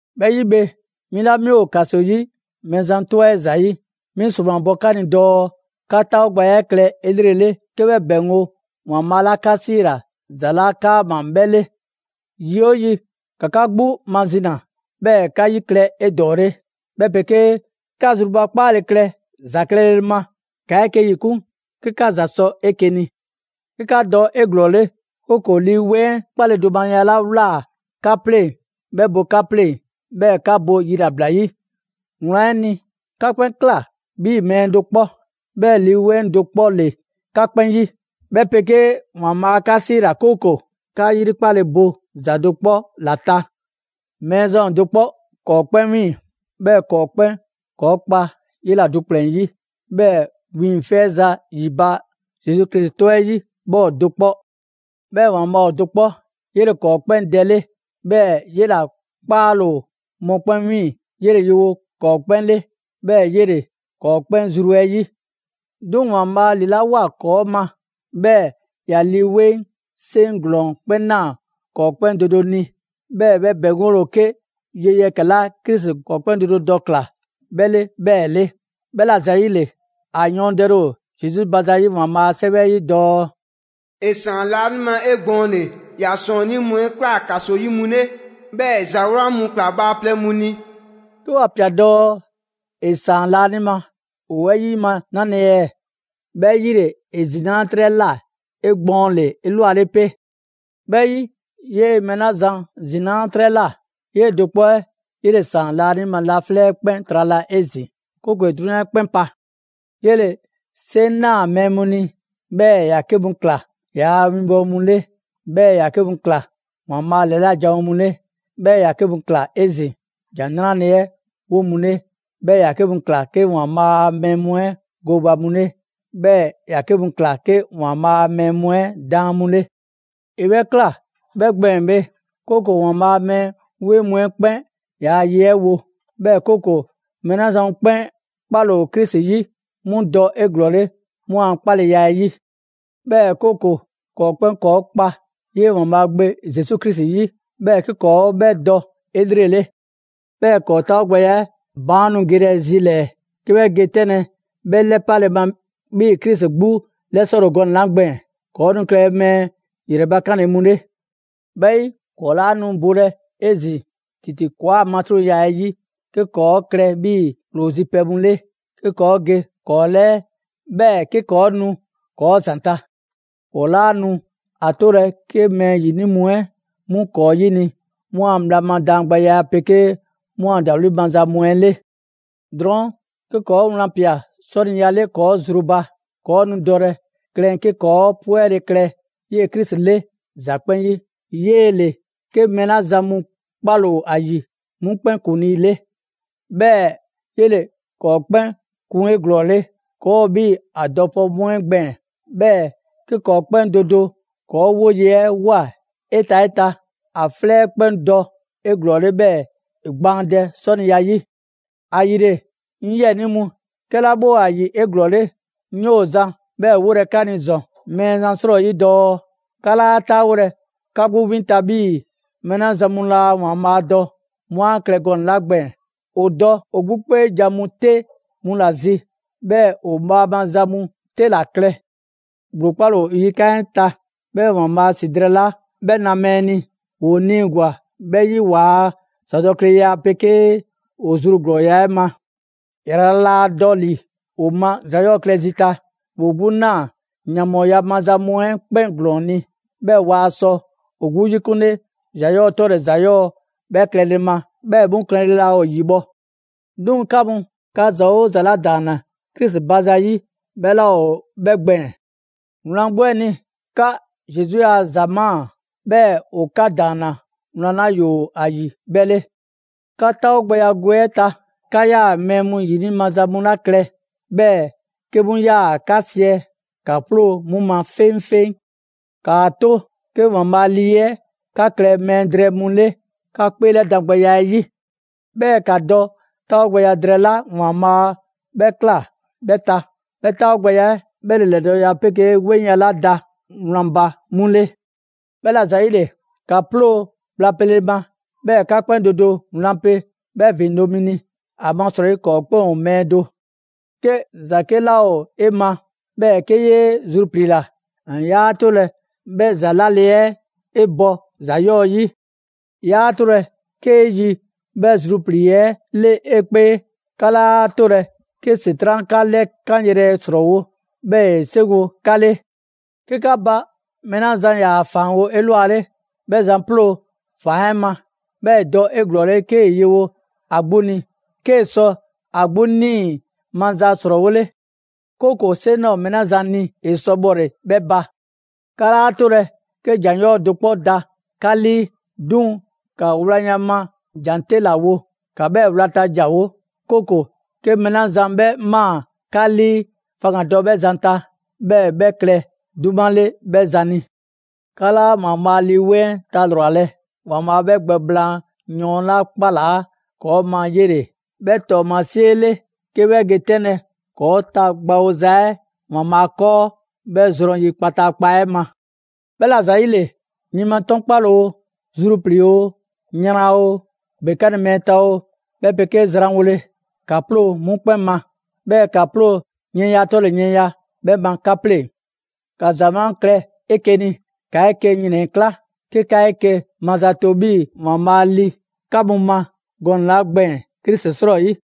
'Bhɛ 'yi bhe, 'mi 'la 'mi ‑o ‑kaso 'yi Mɛɛzan 'tɔ 'ɛ ‑zayi', 'mi 'sromabɔ 'ka ni dɔɔ 'ka 'taawogbɛya 'ɛ klɛ 'elrele 'ke 'bhɛ ‑bɛŋgo' ‑Waanbhaa' 'ka 'siila‑ ‑za 'la 'kaama‑ 'bhɛ 'le. Yi 'oo yi, ‑ka 'ka 'gbu mazina, 'bhɛɛ‑ 'ka 'yi klɛ 'edɔɔle, 'bhɛ 'pegee 'ka zrubakpaale klɛ ‑za klɛle ma. 'Ka 'eke‑ ‑yikun' 'ke 'ka ‑za sɔ 'eke‑ ni; 'ke 'ka dɔ 'eglɔɔle, 'kooko‑ Lii 'Weŋ 'ɛ 'kpaledomaya 'la ꞊wlaa 'ka 'pleŋ‑ 'bhɛ bo 'ka 'pleŋ‑, 'bhɛɛ‑ 'ka bo yilabla 'yi. Wlan 'ɛ ni, 'ka 'kpɛn ꞊kla 'bhii‑ mɛɛ do 'kpɔ, 'bhɛɛ‑ Lii 'Weŋ do 'kpɔ ‑le 'ka 'kpɛn 'yi. 'Bhɛ 'pegee ‑Waanbhaa' 'ka 'siila‑ 'kooko‑ 'ka 'yrikpale bo ‑za do 'kpɔ ‑la ta. Mɛɛzan ‑o do 'kpɔ ‑kɔɔ' 'kpɛn 'wiiŋ‑, 'bhɛɛ‑ ‑kɔɔ' 'kpɛn ‑kɔɔ' kpa 'yela‑ do ‑kplɛn 'yi, 'bhɛɛ‑ 'wiiŋfɛza ‑yi ba Zesu 'tɔ 'ɛ 'yi 'bhɛ ‑o do 'kpɔ. 'Bhɛɛ‑ ‑Waanbhaa' ‑o do 'kpɔ, 'yele‑ ‑kɔɔ' 'kpɛn Dɛ 'le; 'bhɛɛ‑ 'yela‑ 'kpaale‑ ‑o mɔkpɛn' 'wiiŋ‑, 'yele‑ yewo ‑kɔɔ' 'kpɛn 'le, 'bhɛɛ‑ 'yele‑ ‑kɔɔ' 'kpɛn zru 'ɛ 'yi. 'Duŋ‑ ‑Waanbhaa' ‑lilawoa ‑kɔɔ' ma, 'bhɛɛ‑ ‑ya Lii 'Weŋ 'seŋ 'ɛ ‑glɔɔn 'kpɛn ꞊naa ‑kɔɔ' 'kpɛn do do ni, 'bhɛɛ‑ 'bhɛ ‑bɛŋgole ‑o 'ke ye yɛkɛ‑ 'la Krisi ‑kɔɔ' 'kpɛn do do dɔ ꞊kla 'bhɛ 'le 'bhɛɛ‑ 'le. 'Bhɛla‑ ‑zayile, ‑a yɔɔndɛle ‑o Zesu ba zayi' ‑Waanbhaa' a 'Sɛwɛ 'ɛ 'yi dɔɔ: «‑E ‑saan laanima 'egbɔɔnle, ‑ya ‑sɔɔnnii' mu 'ɛ ꞊kla ‑kaso 'yi mu 'le, 'bhɛɛ‑ ‑e ‑za 'wlan mu ꞊kla bhaaplɛŋ mu ni.» 'Ke ‑wa ꞊pia dɔɔ: «‑E ‑saan laanima», ‑o 'bhɛ 'yima‑ 'nale‑ ɛɛ? 'Bhɛ 'yi ‑le ‑e ‑zinaa' 'trɛ ꞊la 'egbɔɔnle 'elwale 'pe. 'Bhɛ 'yi, 'yee‑ mɛɛ 'la zan ‑zinaa' 'trɛ ꞊la, 'yee‑ do 'kpɔ 'ɛ 'yele‑ ‑saan laanima laflɛ' 'ɛ 'kpɛn trala 'ezin‑, 'kooko‑ ‑e 'drunyan 'ɛ 'kpɛn pa. 'Yele‑ 'seŋ 'naa‑ mɛɛ mu ni, 'bhɛɛ‑ ‑ya 'ke mu ꞊kla ‑yaa' winbɔwo mu 'le, 'bhɛɛ‑ ‑ya 'ke mu ꞊kla ‑Waanbhaa' a ‑lɛla' janwo mu 'le, 'bhɛɛ‑ ‑ya 'ke mu ꞊kla 'ezin‑ ‑Jan 'Nrale‑ 'ɛ 'wo mu 'le, 'bhɛɛ‑ ‑ya 'ke mu ꞊kla 'ke ‑Waanbhaa' a mɛɛ mu 'ɛ gooba mu 'le, 'bhɛɛ ‑ya 'ke mu ꞊kla 'ke ‑Waanbhaa' a mɛɛ mu 'ɛ daan mu 'le. ‑E 'bhɛ ꞊kla 'bhɛ gbɛɛn‑ bhe, 'kooko‑ ‑Waanbhaa' a mɛɛ 'weŋ mu 'ɛ 'kpɛn ‑yaa' ye 'ɛ wo, 'bhɛɛ‑ 'kooko‑ mɛɛ 'la zan mu 'kpɛn 'kpale‑ ‑o Krisi 'yi, 'mu dɔ 'eglɔɔle 'mu a 'kpaleya 'ɛ yi. 'Bhɛɛ‑ 'kooko‑ ‑kɔɔ' 'kpɛn ‑kɔɔ' kpa 'yee‑ ‑Waanbhaa' Gbe Zesu Krisi 'yi, 'bhɛɛ‑ 'ke ‑kɔɔ' 'bhɛ dɔ 'elrele. 'Bhɛɛ‑ ‑kɔɔ' 'taawogbɛya 'ɛ baan' nu gelɛ zi ‑lɛɛ 'ke 'bhɛ ge 'tɛnlɛ‑ 'bhɛ 'lɛpale ma 'bhii‑ Krisi 'gbu 'lɛsɔle ‑o gɔnɛ‑ 'la gbɛɛn‑. ‑Kɔɔ' nu klɛlɛ mɛɛ ‑yrɛbakanle mu 'le. 'Bhɛ 'yi, ‑kɔɔ' 'laa nu bolɛ 'ezin‑ ‑titi ‑kɔɔa' matruŋya 'ɛ 'yi 'ke ‑kɔɔ' klɛ 'bhii‑ ‑ploo zi pɛ mu 'le, 'ke ‑kɔɔ' ge ‑kɔɔ' 'lɛɛ, 'bhɛɛ‑ 'ke ‑kɔɔ' nu ‑kɔɔ' ‑zanta'. ‑Kɔɔ' 'laa nu ‑a 'tolɛ‑ 'ke mɛɛ 'yini‑ mu 'ɛ 'mu ‑kɔɔ' 'yini‑ 'mu a bhla ma daangbɛya 'ɛ 'pegee 'mu a ‑dawli' maza mu 'ɛ 'le. Drɔɔn', 'ke ‑kɔɔ' wlan ꞊pia 'sɔniya 'le ‑kɔɔ' zru ba, ‑kɔɔ' nu dɔlɛ klɛn 'ke ‑kɔɔ' 'pwɛle‑ klɛ 'yee‑ Krisi 'le ‑za 'kpɛn 'yi; 'yee‑ ‑le 'ke mɛɛ 'la zan mu 'kpale‑ ‑o ‑a ‑yi 'mu 'kpɛn ‑kuŋlii 'le. 'Bhɛɛ‑ 'yele‑ ‑kɔɔ' 'kpɛn kun 'eglɔɔle. ‑Kɔɔ' ‑o 'bhii‑ ‑a dɔpɛ mu 'ɛ gbɛɛn‑, 'bhɛɛ‑ 'ke ‑kɔɔ' 'kpɛn do do ‑kɔɔ' 'woye‑ 'ɛ ꞊woa 'eta‑ 'eta‑, ‑a 'flɛ 'ɛ 'kpɛn dɔ 'eglɔɔle 'bhɛɛ‑ ‑e gbaandɛ 'sɔniya 'yi. ‑Ayile, 'ŋ 'yiɛnii mu, 'kɛla 'bhɛ ‑o ‑a ‑yi 'eglɔɔle, 'ŋ 'yoo‑ zan 'bhɛɛ‑ 'wolɛ‑ ka ni ‑zɔn Mɛɛzan 'srɔyi dɔɔ: 'ka 'laa 'taawolɛ 'ka 'gbu 'win ta 'bhii‑ mɛɛ 'la zan mu laa ‑Waanbhaa' dɔ 'mu 'a klɛ gɔnɛ‑ 'la gbɛɛn‑. ‑O dɔ ‑o 'gbu 'kpeejan‑ mu 'te 'mu ‑la zi, 'bhɛɛ‑ ‑o bhaama za mu 'te ‑la klɛ. ‑Gblo 'kpale‑ ‑o ‑o yikan' 'ɛ ta, 'bhɛɛ‑ ‑Waanbhaa' ‑si drɛɛ 'la 'bhɛ na mɛɛ ni, ‑woo 'niigwa‑ 'bhɛ 'yi waa ‑zadɔkleya 'ɛ 'pegee ‑o zru ‑glɔɔya' 'ɛ ma. ‑Yrala' laa dɔ ‑li ‑o ma ‑za 'yɔɔ‑ klɛ zi ta, ‑woo 'gbu ꞊naa yanbhɔɔya maza mu 'ɛ 'kpɛn ‑glɔɔn ni, 'bhɛɛ‑ waa sɔ ‑o 'gbu 'yikunle ‑za 'yɔɔ‑ 'tɔle‑ ‑za 'yɔɔ‑ 'bhɛ klɛle ma, 'bhɛɛ‑ 'mu klɛle laa ‑o ‑yibhɔ'. 'Duŋ‑ 'ka mu, 'ka ‑za 'oo ‑za 'la ‑daanna Krisi ba za 'yi 'bhɛ 'laa ‑o 'bhɛ gbɛɛn‑. Wlan 'gbu 'ɛ ni, 'ka Zesu a za ‑maa; 'bhɛɛ‑ ‑o 'ka ‑daanna wlan 'la ‑yoo ‑a ‑yi 'bhɛ 'le. 'Ka 'taawogbɛya gwe 'ɛ ta, 'ka 'yaa‑ mɛɛ ‑yini' maza mu 'la klɛ, 'bhɛɛ‑ 'ke 'mu 'yaa‑ 'ka siɛ, ‑ka 'ploo 'mu ma 'feŋfeŋ. ‑Kaa 'to 'ke ‑Waanbhaa' Lii 'ɛ 'ka klɛ mɛɛ drɛɛ mu 'le 'ka 'kpeelɛdangbɛya 'ɛ 'yi. 'Bhɛɛ‑ ‑ka dɔ 'taawogbɛya drɛɛ 'la ‑Waanbhaa' 'bhɛ꞊kla 'bhɛ ta, 'bhɛ 'taawogbɛya 'ɛ 'bhɛ ‑le ‑lɛdɔɔleya 'pegee 'weŋya‑ 'la da wlan ba 'mu 'le. 'Bhɛla‑ ‑zayile, ‑ka 'ploo‑ bhla pele ma; 'bhɛɛ‑ 'ka 'kpɛn do do wlan pe 'bhɛ ‑vindo' mi ni, ‑amasrɔyi ‑kɔɔ' 'kpɛn ‑o mɛɛ do. 'Ke ‑za 'ke ꞊laa 'e ma, 'bhɛɛ‑ 'ke 'yee zrupliila, 'yaa 'tolɛ‑ 'bhɛ ‑za 'lale‑ 'ɛ 'e bɔ ‑za 'yɔɔ‑ 'yi; 'yaa‑ 'tolɛ‑ 'kee yi 'bhɛ zruplii‑ 'ɛ 'le 'e 'kpee. 'Ka 'laa 'tolɛ‑ 'ke ‑Setran' 'ka 'lɛkanyrɛ ‑srɔɔwo', 'bhɛɛ‑ ‑e 'seŋgo‑ 'ka 'le. 'Ke 'ka ba mɛɛ 'la zan ‑yaa ‑faanwo' 'elwale, 'bhɛ zan 'ploo ‑faan 'ɛ ma. 'Bhɛɛ‑ ‑e dɔ 'eglɔɔle 'kee‑ yewo ‑a 'gbu ni, 'kee‑ sɔ ‑a 'gbu 'nii‑ maza ‑srɔɔwole'; 'kooko‑ 'seŋ 'laa ‑o mɛɛ 'la zan ni ‑e sɔ bhɔle‑ 'bhɛ ba. 'Ka 'laa 'tolɛ‑ 'ke ‑jan 'yɔɔ‑ do 'kpɔ da 'ka 'lii; 'duŋ‑ ‑ka wlanya ma jan 'te ‑la wo. ‑Ka 'bhɛɛ‑ 'wlata‑ ‑janwo', 'kooko‑ 'ke mɛɛ 'la zan 'bhɛ ꞊maa 'ka 'lii, faŋgandɔ 'bhɛ zan ta, 'bhɛɛ‑ 'bhɛ klɛ 'duma 'le 'bhɛ zan ni. 'Ka 'laa ‑Waanbhaa' Lii 'Weŋ 'ɛ talrwalɛ. ‑Waanbhaa' 'bhɛ gbɛ blaan yɔɔn 'la 'kpalaa ‑kɔɔ' ma 'yele‑ 'bhɛ ‑tɔɔmasie 'le 'ke 'bhɛ ge 'tɛnlɛ‑ ‑kɔɔ' tagbawoza 'ɛ ‑Waanbhaa' 'kɔɔ 'bhɛ zrɔn yi kpataakpa 'ɛ ma. 'Bhɛla‑ ‑zayile, yin ma 'tɔnkpale oo, zruplii‑ oo, yran oo, ‑gbekanle mɛɛ ta oo, 'bhɛ 'pegee ‑zwanwole, ‑ka 'ploo‑ 'mu 'kpɛn ma. 'Bhɛɛ‑ ‑ka 'ploo yiɛnya 'tɔle‑ yiɛnya 'bhɛ ma 'ka 'pleŋ‑. ‑Ka ‑za 'wlan klɛ 'eke‑ ni, ‑ka 'eke‑ ‑yrɛnkla', 'ke 'ka 'eke‑ mazato 'bhii‑ ‑Waanbhaa' ‑li 'ka mu ma gɔnɛ‑ 'la gbɛɛn‑ Krisi 'srɔyi.